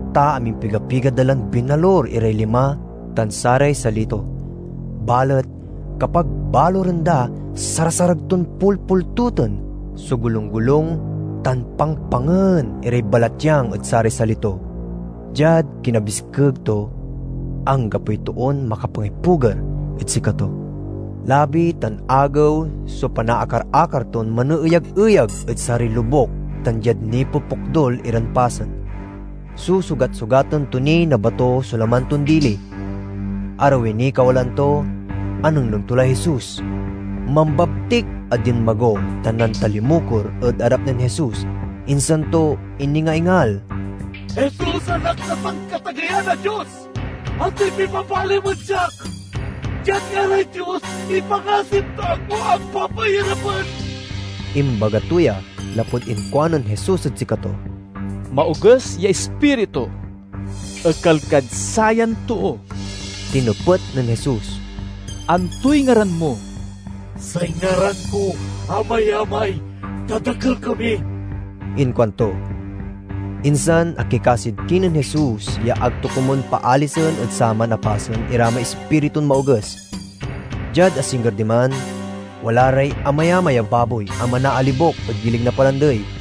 ta amimpiga-piga da lan binalur iray lima tan saray sali to, balet kapag baluren da sarasarag ton pulpultoten so golung-golung tan pangpangen iray balatyang ed saray sali to. Diad kinabiskeg to anggapoy toon makapangipuger ed sikato. Labi tan agew so panaakar-akar ton maneeyageyag ed saray lobuk tan diad nipokpokdul iran pasen. Susugat-sugaten to ni na bato so laman ton dili. Arawi niy kawalaan to, anengneng to lay Jesus. Mambabtik a dinmago tan nantalimukor ed arap nen Jesus, insan to iningaingal, "Jesus, Anak na Sankatageyan a Dios, antoy pibabalim ed siak? Diad ngaray Dios, ipangasim ta ag mo ak papairapen!" (Imbaga to ya lapud inkuanen Jesus ed sikato, "Maoges ya ispiritu, ekal kad sayan too!") Tinepet nen Jesus, "Antoy ngaran mo?" "Say ngaran ko 'Amayamay,' ta dakel kami," inkuanto. Insan akikasid kinen Jesus ya ag to komun paalisen ed saman a pasen ira may ispiritun maoges. Diad asingger diman, wala ray amayamay a baboy a manaalibok ed gilig na palandey.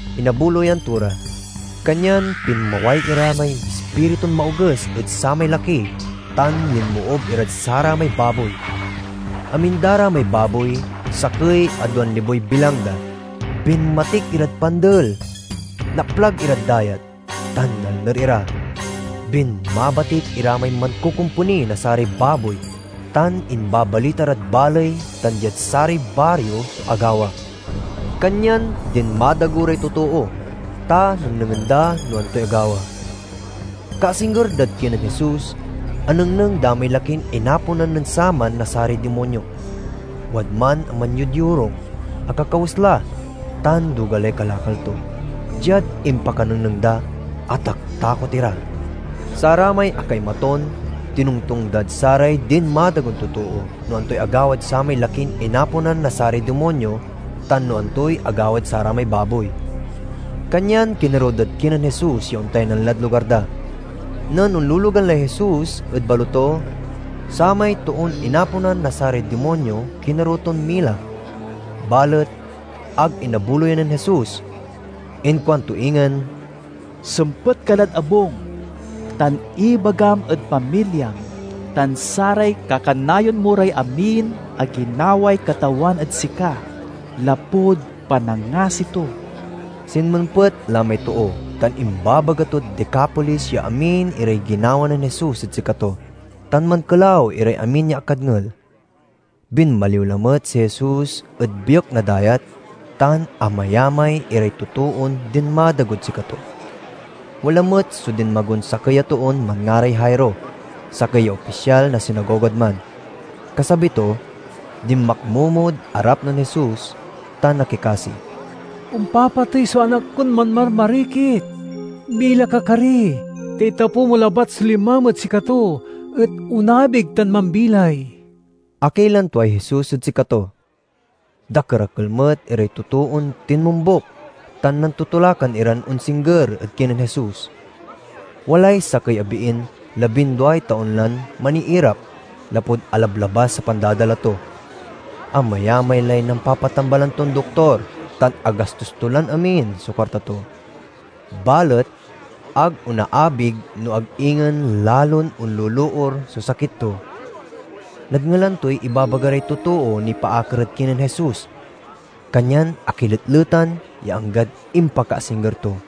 Inabuloyan to ra, kanyan pinmaway ira may ispiritun maoges ed samay laki tan linmoob irad saramay baboy. Amin da ra may baboy—sakey a duan liboy bilang da—binmatik irad pandel, naplag irad dayat tan nalner ira. Binmabatik ira may mankokomponi na saray baboy tan imbabalita rad baley tan diad saray bario so agawa. Kanyan dinmadago ray totoo, ta nengnengen da no antoy agawa. Kaasingger dad kinen Jesus, anengneng da may lakin inaponan nen saman na saray dimonyo. Wadman a manyodyorung, akakawes la, tan duga lay kalakal to. Diad impakanengneng da, ataktakot ira. Saramay akaimaton tinongtong dad saray dinmadagon totoo no antoy agawad samay lakin inaponan na saray dimonyo, tan no antoy agawad saramay baboy. Kanyan kinerew dad kinen Jesus ya ontaynan lad lugar da. Nen onlologan lay Jesus ed baloto, samay toon inaponan na saray dimonyo kinerew ton mila, balet ag inabuloyan nen Jesus. Inkuanto ingen, "Sempet ka lad abung, tan ibagam ed pamilyam tan saray kakanayon mo ray amin a ginaway Katawan ed sika lapud panangasi to." Sinmempet la may too tan imababaga tod Decapolis ya amin iray ginawa nen Jesus ed sikato; tan mankelaw iray amin ya akadngel. Binmaliw lamet si Jesus ed biek na dayat, tan amayamay iray totoon dinmadagod sikato. Wala met so dinmagon sakey a toon manngaray Jairo, sakey ya opisyal na sinagogad man. Kasabi to, dinmakmomod arap nen Jesus tan akikasi, "Ompapatey so anak kon manmarmarikit. Mila ka kari, ta itapew mo labat so limam ed sikato, et onabig tao mambilay!" Akilan tuay Jesus ed sikato. Dakerakel met iray totoon tinmombuk tan nantotolakan iran onsingger ed kinen Jesus. Walay sakey a biin labinduay taon lan maniirap lapud alablabas a pandadala to. Amayamay lay nampapatambalan ton doktor tan agastos to lan amin so kuarta to, balet ag onaabig no ag ingen lalon onloloor so sakit to. Nadngelan toy ibabaga ray totoo nipaakar ed kinen Jesus, kanyan akiletletan ya anggad impakaasingger to.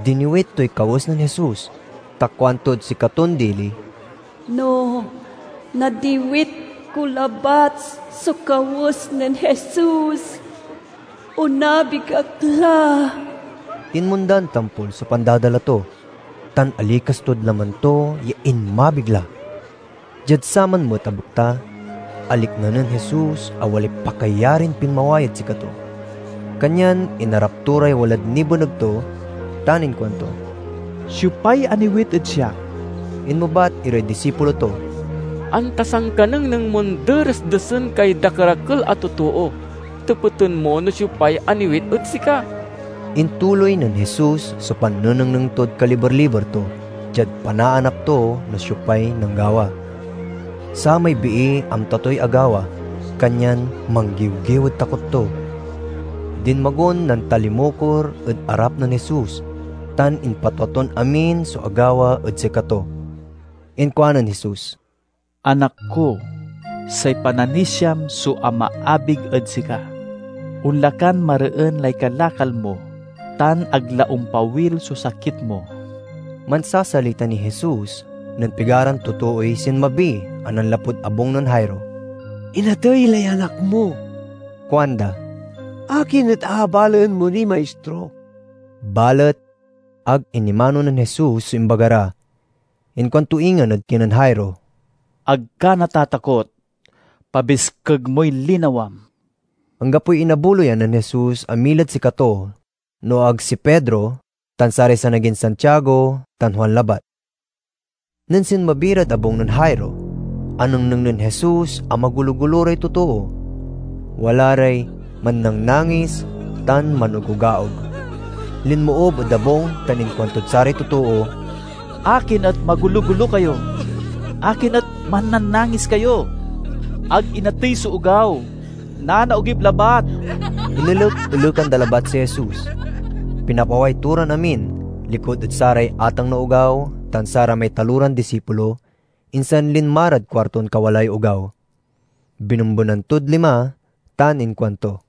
Diniwit toy kawes nen Jesus, ta kuantod sikaton dili, "No nadiwit ko labat so kawes nen Jesus, onabig ak la." Tinmondan tampol so pandadala to, tan alikas tod laman to ya inmabig la. Diad saman met a bekta, alikna nen Jesus a walay pakayarin pinmaway ed sikato, kanyan inarap to ray walad nibeneg to tan inkuanto, "Siopay aniwit ed siak?" Inmebat iray disipulo to, "Anta sankanengneng mon deresdesen kay dakerakel a totoo, tepeten mo no siopay aniwit ed sika?" Intuloy nen Jesus so pannenengneng tod kaliber-liber to, diad panaanap to no siopay nanggawa. Samay bii amta toy agawa, kanyan manggiwgiw ed takot to. Dinmagon nantalimukor ed arap nen Jesus, tan impatwa ton amin so agawa ed sikato. Inkuanen Jesus, "Anak ko, say pananisiam so amaabig ed sika. Onla kan mareen lay kalakal mo, tan ag la ompawil so sakit mo." Mansasalita niy Jesus nen pigaran totooy sinmabi a nanlapud abung nen Jairo. "Inatey lay anak mo," kuanda, "akin et aabalaen mo niy Maistro?" Balet ag inimano nen Jesus so imbaga ra. Inkuan to ingen ed kinen Jairo, "Ag ka natatakot; pabiskeg moy linawam." Anggapoy inabuloyan nen Jesus a milad sikato no ag si Pedro tan saray sanagin Santiago tan Juan labat. Nen sinmabi rad abung nen Jairo, anengneng nen Jesus a magolo-golo ray totoo. Wala ray mannangnangis tan manogogaog. Linmoob ed abung tan inkuantod saray totoo, "Akin et magologolo kayo? Akin et mannangnangis kayo? Ag inatey so ogaw; nanaogip labat!" Inelek-elekan da labat si Jesus. Pinapaway to ran amin, likud ed saray ateng na ogaw tan saramay taloran disipulo, insan linma rad kuarton kawalaay ogaw. Binembenan tod lima tan inkuanto,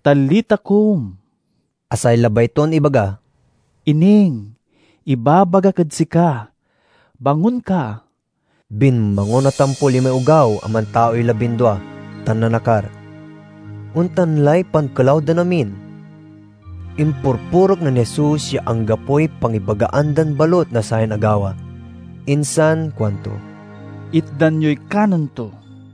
"Talitha, koum," a say labay ton ibaga, "Ining, ibabagak ed sika, bangon ka!" Binmangon a tampol imay ogaw, a mantaoy labindua, tan nanakar. Ontan lay pankelaw dan amin. Impurpurek nen Jesus ya anggapoy pangibagaan dan balut na sayan agawa. Insan kuanto, "Itdan yoy kanen to."